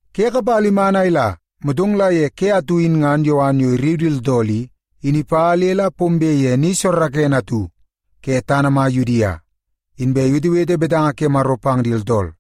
Ke kapala iman a ila, motong la ye ke atu in ngan Yowan yo irriu di tooltool i, in ipa le la pombe ye ni soorookoonoo atu ke tana mai Yudia, inbe iwetewete betanga ke Maro pang di tooltool.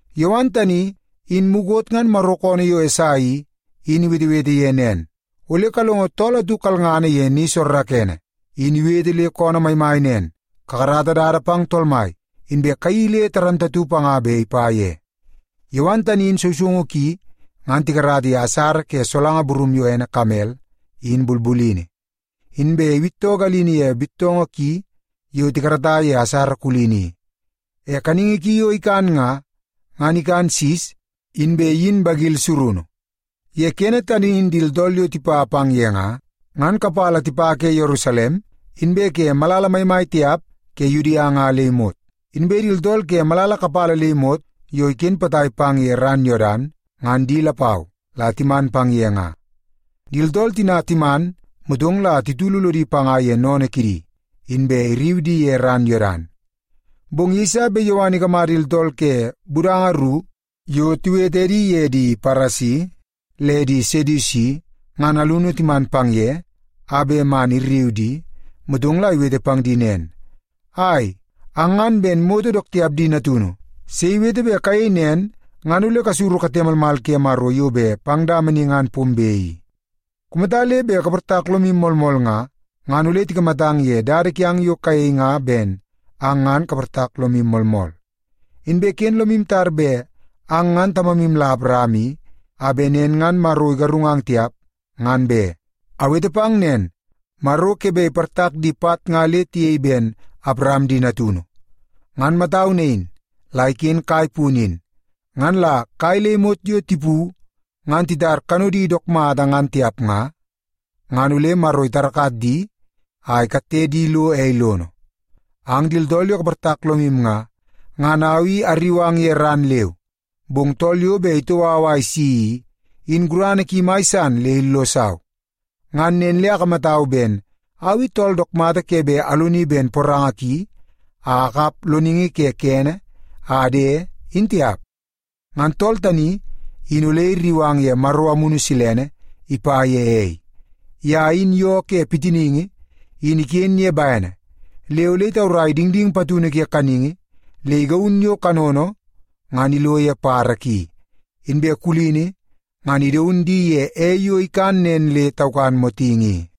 Yowan tani, in mukot ngan Maro koonoo yo Esai i, in iwetewete ye nen, “Ole kalongo tool atu kalngana ye ni soorookoonoo, in iwete le koonoo maimai nen, ‘Kakarata dada pang Tool Mai, inbe kayeii le dundunngana panga bet ipa ye.’” Yowan tani in sousoungu ki ngan tikarata ye asara ke solanga burum yo ene kamel in bulbulini. Inbe iwittoo galini ye bittoongoo ki yo tikarata ye asara kulini i. E kaningi ki yo ikan nga, ngan ikan sis inbe iyin bagil surunu. Ye kene tani in di tooltool yo tipa pang ye nga, ngan kapala tipa ke Yerusalem, inbe ke malala maimai tiap ke Yudia nga le imot. Inbe di tooltool ke malala kapala le imot yo iken potai pang ye ran Yodan, ngan di lapau la timan pang ye nga. Di tooltool tina timan, motong la titulu lodi panga ye sennene kidi, inbe irriu di ye ran Yodan. Bong yeiso bet Yowan ikamata di tooltool ke budanga ru yo tiwete edi ye di Paresi le di Sedusi, ngan alunu timan pang ye a bet man irriu di, motong la iwete pang di nen, “Ai, ang ngan ben moto dook tiap di natunu! Sei iwete bet kayei nen ngan ole kasuru kate malmal ke Maro yo bet pang dama ni ngan pombe i? Kumata le bet kaportak lomu moolmool nga, ngan ole tikamatang ye dada kiang yo kayei nga ben ang ngan kaportak lomu moolmool. Inbe ken lomu tar bet ang ngan tamamu la Awaram i, a bet nen ngan Maro igarungang tiap, ngan be. Awete pang nen, Maro ke bet iportak di pat nga le tiyei ben Awaram di natunu. Ngan matau nain la iken kai punu in. Ngan la kai le imot yo tipu ngan titar kanodi dook mata ngan tiap nga, ngan ole Maro itarakat di a ikatte di lo ei lono. “Ang di tooltool yo kaportak lomu nga, ngan au i arriu ang ye ran leu. Bong tool yo bet itoo au a isi i, in gurana ki mai san le illosau. Ngan nen le akamatau ben au i tool dook mata ke bet aloni ben poranga ki a akap loningi ke kene a ade in tiap. Ngan tool tani in ole irriu ang ye Maro Amunu Silene ipa ye ei. Ye in yoo ke pitiningi in iken ye bene, le ole itaurai dingding patunu ke kaningi le igaun yo kanono ngan ilo ye badabada ki, inbe kulini ngan idaun di ye ei yo ikan nen le taukan motingi i.”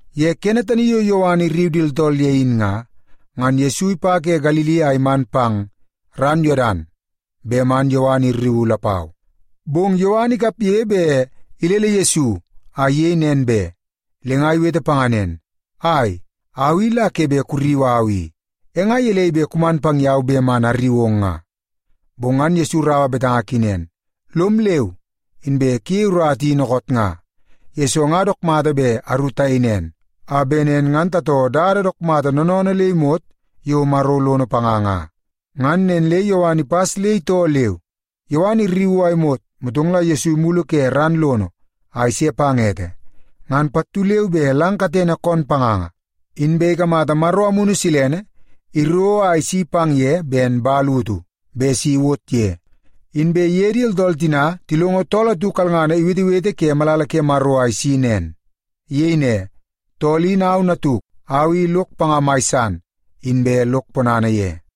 Ye kene tani yo Yowan irriu di tooltool ye in nga, ngan Yesu ipa ke Galili a iman pang ran Yodan bet man Yowan irriuu lapau. Bong Yowan ikapge bet ilele Yesu a iyei nen be. Le nga iwete panga nen, “Ai, au i la ke bet kurriu au i. E nga gelei bet kuman pang yau bet man arriu ong nga?” Bong ngan Yesu iraua betanga ki nen, “Lom leu, inbe kuyei urata i dookoot nga, yesoo nga dook mata bet aru tayei nen, a bet nen ngan tatoo dada dook mata noonoonoo le imot yo Maro lono panga nga.” Ngan nen le Yowan ipas le itoo leu. Yowan irriuu a imot, motong Yesu imulu ke ran lono a ise pang ete, ngan pattu leu be lang katene koon panganga, inbe ikamata Maro Amunu Silene iro a isi pang ye ben man utu bet si iwot ye. Inbe tool atu kalngana iwetewete ke malala ke Maro a isi nen. Iyei ne, “Tool in au natuk. Au i lok panga mai san, inbe lok ponana ye.”